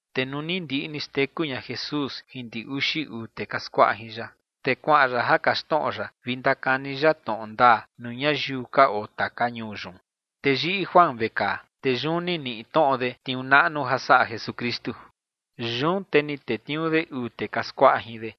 Te nuu ni ndiꞌi ni xteku ña Jesús jin ndi uxi uu tee ka skuaꞌa jin ya, te kuaꞌan ya ja kaxtnoꞌo ya vi ndakani ya tnoꞌo ndaa nuu ñayiu ka oo taka ñuu yun. Te yiꞌi Juan vekaa. Te yun ni niꞌi tnoꞌo de tniuu naꞌnu ja saꞌa Jesukristu. Yun te ni tetniuu de uu tee ka skuaꞌa jin de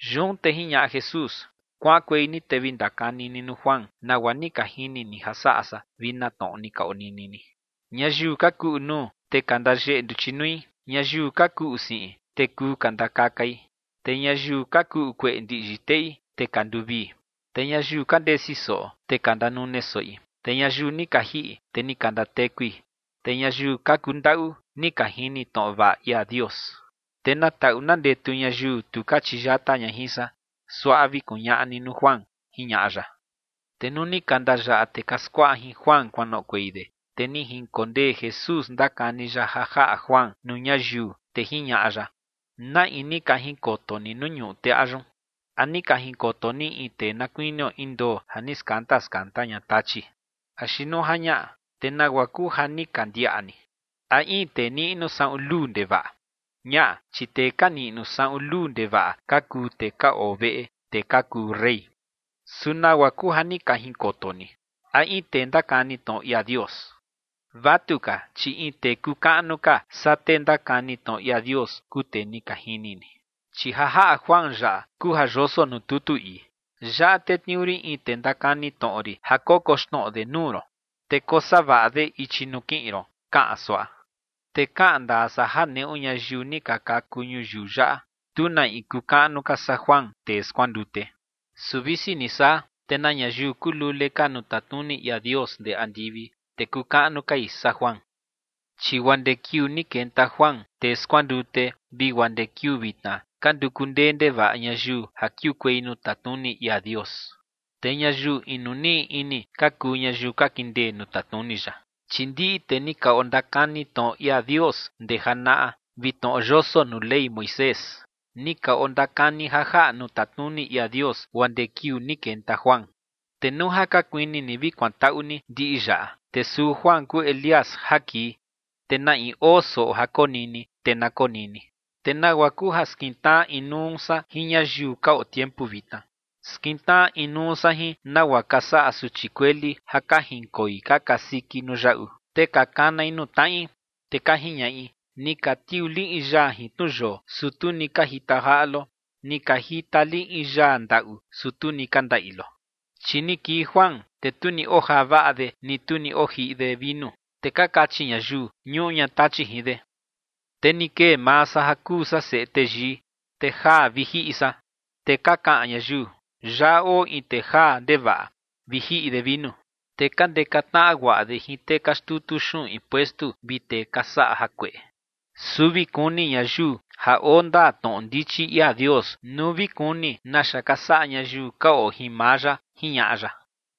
Yun te jiñaꞌa Jesús: ͏―͏Kuaꞌankuei ni te vi ndakani ni nuu Juan nagua ni ka jini ni ja saꞌa san vi na tnoꞌo ni ka onini ni. Ñayiu ka kuꞌu nuu te ka ndayeꞌe nduchi nui. Ñayiu ka kuꞌu siꞌin, te kuu ka ndakakai. Te ñayiu ka kuꞌu kueꞌe ndiꞌyi teꞌi, te ka nduvii. Te ñayiu ka ndesi soꞌo, te ka ndanune soꞌi. Te ñayiu ni ka jiꞌi, te ni ka ndatekui. Te ñayiu ka kundaꞌu, ni ka jini tnoꞌo vaꞌa ia Dios. Te na taꞌu na ndetu ñayiu tu ka chiyata ña jin san. Suaꞌa vi kuñaꞌa ni nuu Juan ͏―͏jiñaꞌa ya. Te nuu ni ka ndayaꞌa tee ka skuaꞌa jin Juan kuanoꞌokuei de, te ni jinkondee Jesús ndakani ya ja jaꞌa Juan nuu ñayiu, te jiñaꞌa ya: ͏―͏¿Na in ni ka jinkoto ni nuu ñuꞌu teꞌa yun? ¿A ni ka jinkoto ni in tee na kuinio in ndoo ja ni skanda skanda ña tachi? Axi nuu ja ñaꞌa, te ¿nagua kuu ja ni ka ndiaꞌa ni? ¿A in tee niꞌnu saꞌun luu ndevaꞌa? Ñaꞌa, chi tee ka niꞌnu saꞌun luu ndevaꞌa ka kuu tee ka oo veꞌe tee ka kuu rey. Su ¿nagua kuu ja ni ka jinkoto ni? ¿A in tee ndakani tnoꞌo ia Dios? Vatuka, chi in tee kuu kaꞌnu ka saa tee ndakani tnoꞌo ia Dios kuu tee ni ka jini ni. Chi ja jaꞌa Juan yaꞌa kuu ja yoso nuu tutu ii: Yaꞌa tetniuu rin in tee ndakani tnoꞌo rin ja kokoxnoꞌo de nuu ron, te kosavaꞌa de ichi nuu kiꞌin ron, kaꞌan suaꞌa. Te kaꞌan ndaa san ja neꞌu ñayiu ni ka kaku ñuyiu yaꞌa, tu na in kuu kaꞌnu ka saa Juan, tee skuandute. Su visi ni saa, te na ñayiu kuu lule ka nuu tatnuni ia Dios ndee andivi, te kuu kaꞌnu kai saa Juan. ’Chi guaa ndee kiuu ni kenta Juan, tee skuandute, vi guaa ndee kiuu vitna, ka nduku ndee ndevaꞌa ñayiu ja kiukuei nuu tatnuni ia Dios. Te ñayiu inu niꞌi ini ka kuu ñayiu ka kindee nuu tatnuni ya. Chi ndiꞌi tee ni ka ondakani tnoꞌo ia Dios ndee janaꞌa vi tnoꞌo yoso nuu Ley Moisés, ni ka ondakani ja jaꞌa nuu tatnuni ia Dios guaa ndee kiuu ni kenta Juan. Te nuu ja ka kuini ni vi kuantaꞌu ni ndiꞌi yaꞌa, te suu Juan kuu Elías ja kii. Te na in oo soꞌo ja konini, te na konini. ’¿Te nagua kuu ja skintnaꞌa inuu san jin ñayiu ka oo tiempu vitna? Skintnaꞌa inuu san jin nagua ka saꞌa suchi kueli ja ka jinkoi ka kasiki nuu yaꞌu, te ka kanai nuu tnaꞌi. Te ka jiñaꞌi: “Ni ka tiuu li in yaa jin tnu yoo, su tu ni ka jita jaꞌa lo. Ni ka jita li in yaa ndaꞌu, su tu ni ka ndaꞌi lo.” Chi ni kii Juan, te tu ni ojaa vaꞌa de ni tu ni ojiꞌi de vinu, te ka kachi ñayiu: “Ñuꞌu ña Tachi jin de”. Te ni kee maa san ja kuu san Seꞌe Teyii, te jaa vi jiꞌi san, te ka kaꞌan ñayiu: “Yaꞌa oo in tee jaa ndevaꞌa vi jiꞌi de vinu, te ka ndeka tnaꞌa guaꞌa de jin tee ka xtutu xuꞌun impuestu vi tee ka saꞌa jakueꞌe”. Su vi kuni ñayiu ja oo ndaa tnoꞌo ndichi ia Dios nuu vi kuni naxa ka saꞌa ñayiu ka oo jin maa ya ͏―͏jiñaꞌa ya.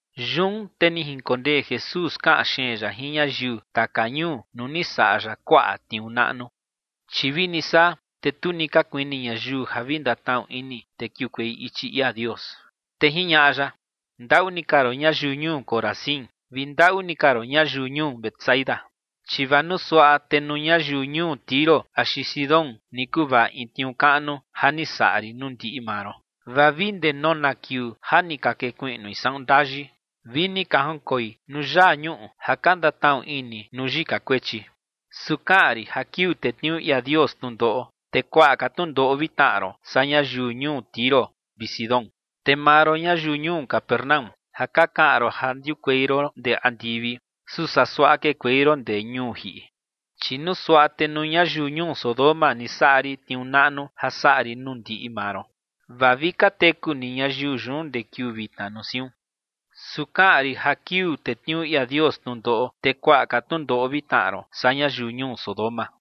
Yun te ni jinkondee Jesús kaꞌan xeen ya jin ñayiu taka ñuu nuu ni saꞌa ya kuaꞌa tniuu naꞌnu. Chi vini saa, te tu ni ka kuini ñayiu ja vi ndatnaꞌu ini te kiukuei ichi ia Dios. Te jiñaꞌa ya: ͏―͏¡Ndaꞌu ni ka roon ñayiu ñuu Corazín vi ndaꞌu ni ka roon ñayiu ñuu Betsaida! Chi vaa nuu suaꞌa, te nuu ñayiu ñuu Tiro axi Sidón ni kuvaꞌa in tniuu kaꞌnu ja ni saꞌa rin nuu ndiꞌi maa ron, vaa vi ndee nona kiuu ja ni ka kekuiꞌnui saꞌun ndayi vi ni ka jinkoi nuu yaa ñuꞌu ja ka ndatnaꞌu ini nuu yika kuechi. Su kaꞌan rin ja kiuu tetniuu ia Dios tnundoꞌo, te kuaꞌa ka tnundoꞌo vi tnaꞌa ron saa ñayiu ñuu Tiro vi Sidón. Te maa ron, ñayiu ñuu Capernaúm, ja ka kaꞌan ron ja ndiukuei ron ndee andivi, su saa suaꞌa kekuei ron ndee ñuu jiꞌi. Chi nuu suaꞌa te nuu ñayiu ñuu Sodoma ni saꞌa rin tniuu naꞌnu ja saꞌa rin nuu ndiꞌi maa ron, vaa vi ka teku ni ñayiu yun ndee kiuu vitna nuu siun. Su kaꞌan rin ja kiuu tetniuu ia Dios tnundoꞌo, te kuaꞌa ka tnundoꞌo vi tnaꞌa ron, saa ñayiu ñuu Sodoma.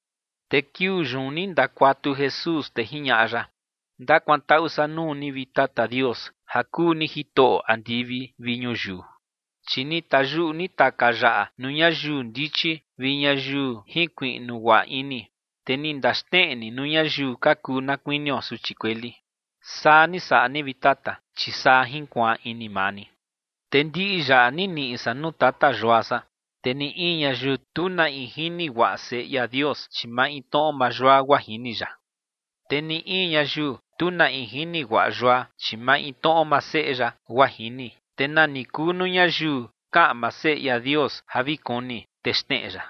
Te kiuu yun ni ndakuatu Jesús, te jiñaꞌa ya: ͏―͏Ndakuantaꞌu san nuu ni, vi Tata Dios, ja kuu ni Jitoꞌo andivi vi ñuyiu, chi ni tayuꞌu ni taka yaꞌa nuu ñayiu ndichi vi ñayiu jinkuiꞌnu guaꞌa ini, te ni ndaxneꞌe ni nuu ñayiu ka kuu na kuinio suchi kueli. Saa ni saꞌa ni, vi Tata, chi saa jinkuaan ini maa ni. ’Te ndiꞌi yaꞌa ni niꞌi san nuu Tata Yua san. Te ni in ñayiu, tu na in jini guaꞌa Seꞌe ia Dios, chi maintnoꞌo maa Yua, guaa jini ya. Te ni in ñayiu, tu na in jini guaꞌa Yua, chi maintnoꞌo maa Seꞌe ya, guaa jini, te nani kuu nuu ñayiu kaꞌan maa Seꞌe ia Dios ja vi kuni, te xneꞌe ya.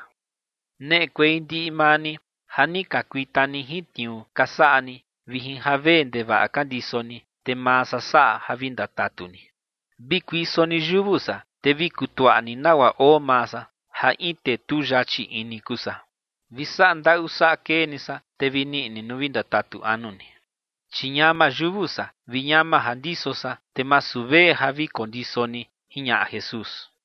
Neꞌekuei ndiꞌi maa ni ja ni ka kuita ni jin tniuu ka saꞌa ni vi jin javee ndevaꞌa ka ndiso ni, te maa san saꞌa ja vi ndatatu ni. Vi kuiso ni yuvu san, te vi kutuaꞌa ni nagua oo maa san, ja in tee tu yachi ini kuu san, vi saꞌa ndaꞌu saꞌa kee ni san, te vi niꞌi ni nuu vi ndatatu anu ni. Chi ñama yuvu san, vi ñama ja ndiso san, te masu vee ja vi kondiso ni ͏―͏jiñaꞌa Jesús.